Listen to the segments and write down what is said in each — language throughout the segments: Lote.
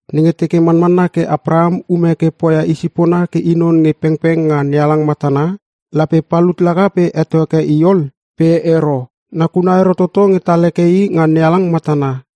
Nenge teke manmanna ke Apraham ume ke poia i sipona ke i non nge pengpeng nga NeHalang matana, lape palut laka pe heto heke i ol. Pe ero. Nakuna ero toto nge tal heke i nga NeHalang matana.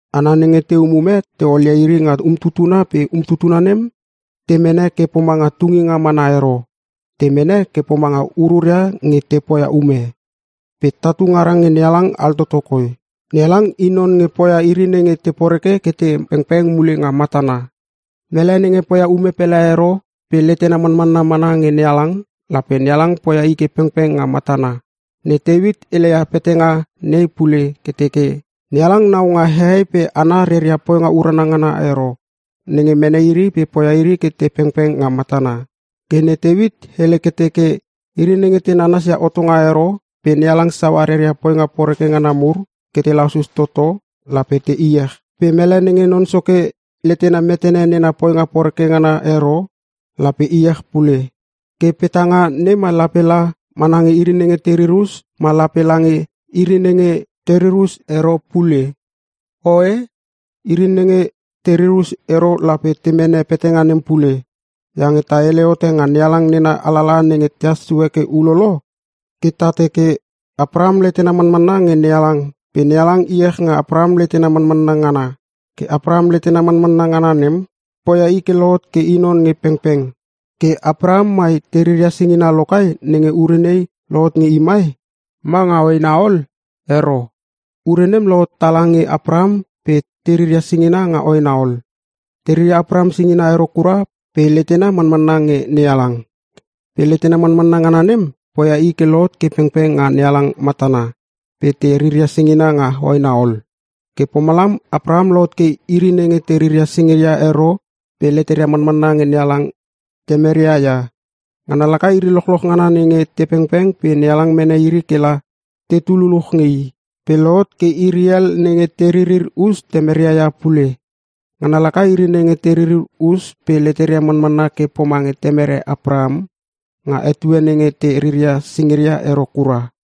Hana nenge te umume te olia iri nga umtutuna pe umtutuna nem te mene ke pomanga tunginga mana ero. Te mene ke pomanga ururia nge te poia ume. Pe tatu ngara nge NeHalang altoto koi. NeHalang i non nenge poia iri nenge te poreke ke te pengpeng mule nga matana. Mele nenge poia ume pele ero pe letena manmanna mana nge NeHalang, lape NeHalang poia i ke pengpeng nga matana. Ne Teuit heleia petanga nei pule ke teke, NeHalang nau nga hehei pe hana reria poinga urana ngana ero, nenge mene iri pe poia iri ke te pengpeng nga matana. Ke ne Teuit hele ke teke, “Iri nenge te nanasia hotonga ero pe NeHalang saua reria poinga poreke ngana mur ke te lasus toto, lape te iech. Pe mele nenge Non Soke letena metene nena poinga poreke ngana ero, lape iech pule.” Ke petanga nei mai lape la mana nge iri nenge te ririr us ma lape lange iri nenge te ririr us ero pule? Oe! Iri nenge te ririr us ero lape te mene petanga nem pule. Iange ta hele hote nga NeHalang nena alalaha nenge tehas sue ke ulolo, ke ta teke, “Apraham letena manmanna nge NeHalang pe NeHalang iech nga Apraham letena manmanna ngana. Ke Apraham letena manmanna ngana nem, poia i ke lohot ke i non nge pengpeng.” Ke Apraham mai te riria singina lo kai nenge ure nei lohot nge i mai? Ma nga hoena ol? Ero, ure nem lohot tala nge Apraham pe te riria singina nga hoena ol. Te riria Apraham singina ero kura pe letena manmanna nge NeHalang. Pe letena manmanna ngana nem poia i ke lohot ke pengpeng nga NeHalang matana, pe te riria singinga nga hoena ol. Ke pomalam Apraham lohot ke iri nenge te riria singiria ero pe leteria manmanna nge NeHalang temeria ia. Ngana laka iri lochloch ngana nenge te pengpeng pe NeHalang mene iri ke la tetu luluch nge i. Pe lohot ke iri hel nenge te ririr us temeria ia pule. Ngana laka iri nenge te ririr us pe leteria manmanna ke pomange temere Apraham, nga etue nenge te riria singina ero kura.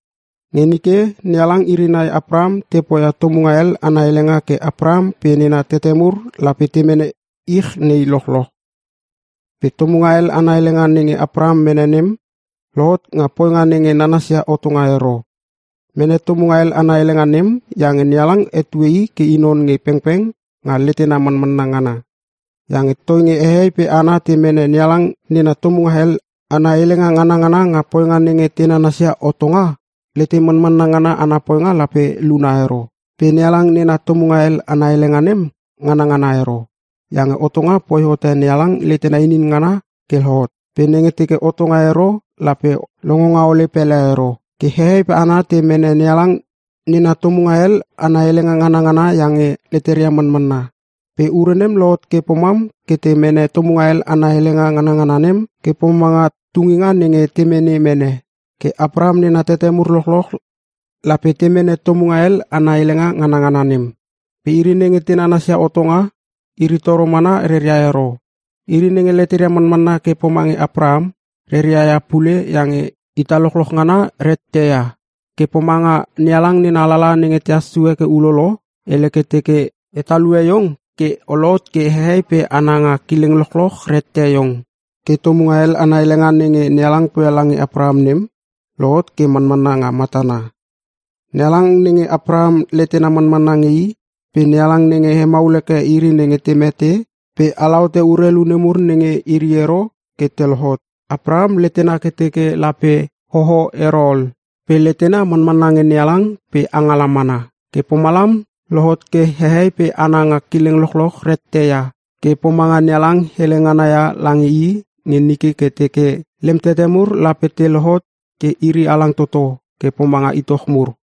Nge nike NeHalang iri nai Apraham te poia tomunga hel ana helenga ke Apraham pe nena tete mur lape te mene ich nei lochloch. Pe tomunga hel ana helenga nenge Apraham mene nem, lohot nga poinga nenge nanasia hotonga ero. Mene tomunga hel ana helenga nem iange NeHalang hetue i ke i non nge pengpeng nga letena manmanna ngana. Iange toinge hehei pe hana te mene NeHalang nena tomunga hel ana helenga nganangana nga poinga nenge te nanasia hotonga, lete manmanna ngana ana poinga lape luna ero. Pe NeHalang nena tomunga hel ana helenga nem nganangana ero. Iange hotonga poi hote NeHalang letena inin ngana ke lohot. Pe nenge teke hotonga ero lape longonga ole pele ero. Ke hehei pe hana te mene NeHalang nena tomunga hel ana helenga nganangana iange leteria manmana. Pe ure nem lohot ke pomam ke te mene tomunga hel ana helenga nganangana nem ke pomanga tunginga nenge te mene mene. Ke Apraham nena tete mur lochloch lape te mene tomunga hel ana helenga nganangana nem. Pe iri nenge te nanasia hotonga, iri toro mana reria ia ero. Iri nenge leteria manmanna ke pomange Apraham, reria ia pule iange ita lochloch ngana rette ia. Ke pomanga NeHalang nena alalaha nenge tehas sue ke ulolo, hele ke teke, “E talue iong ke o lohot ke hehei pe hana nga kileng lochloch reiette iong.” Ke tomunga hel ana helenga nenge NeHalang poia lange Apraham nem, lohot ke manmanna nga matana. NeHalang nenge Apraham letena manmanna nge i pe NeHalang nenge hemaul hekeke iri nenge te mete pe alahotote urelu nemur nenge iri ero ke te lohot. Apraham letena ke teke lape hoho ero ol. Pe letena manmanna nge NeHalang pe angala mana. Ke pomalam lohot ke hehei pe hana nga kileng lochloch reiette ia, ke pomanga NeHalang hele ngana ia lange i nike ke teke, “Lem tete mur lape te lohot ke iri halang toto ke pomanga itoch mur.”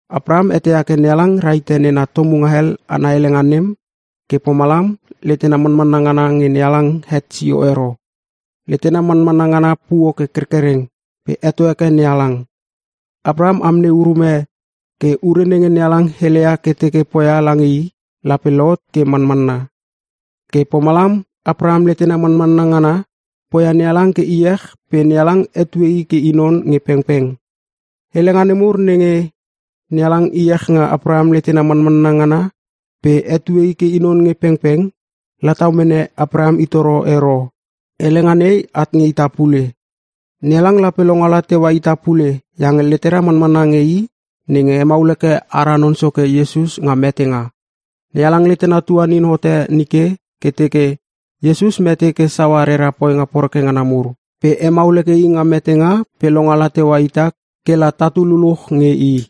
Apraham eteia ke NeHalang rahite nena tomunga hel ana helenga nem, ke pomalam letena manmanna ngana nge NeHalang het sio ero. Letena manmanna ngana puo ke kerkereng pe heto heke NeHalang. Apraham amnei urume ke ure nenge NeHalang heleia ke teke poia lange i lape lohot ke manmanna. Ke pomalam Apraham letena manmanna ngana poia NeHalang ke iech pe NeHalang hetue i ke i non nge pengpeng. Helenga nemur nenge, “NeHalang iech nga Apraham letena manmanna ngana pe hetue i ke i non nge pengpeng,” latau mene Apraham i toro ero. Helenga nei at nge ita pule. NeHalang lape longala teua ita pule iange letera manmanna nge i nenge hemaul heke ara Non Soke Iesus nga metenga. NeHalang letena tuanin hote nike ke teke Iesus mete ke saua rera poinga poreke ngana mur. Pe hemaul heke i nga metenga pe longala teua ita ke la tatu luluch nge I.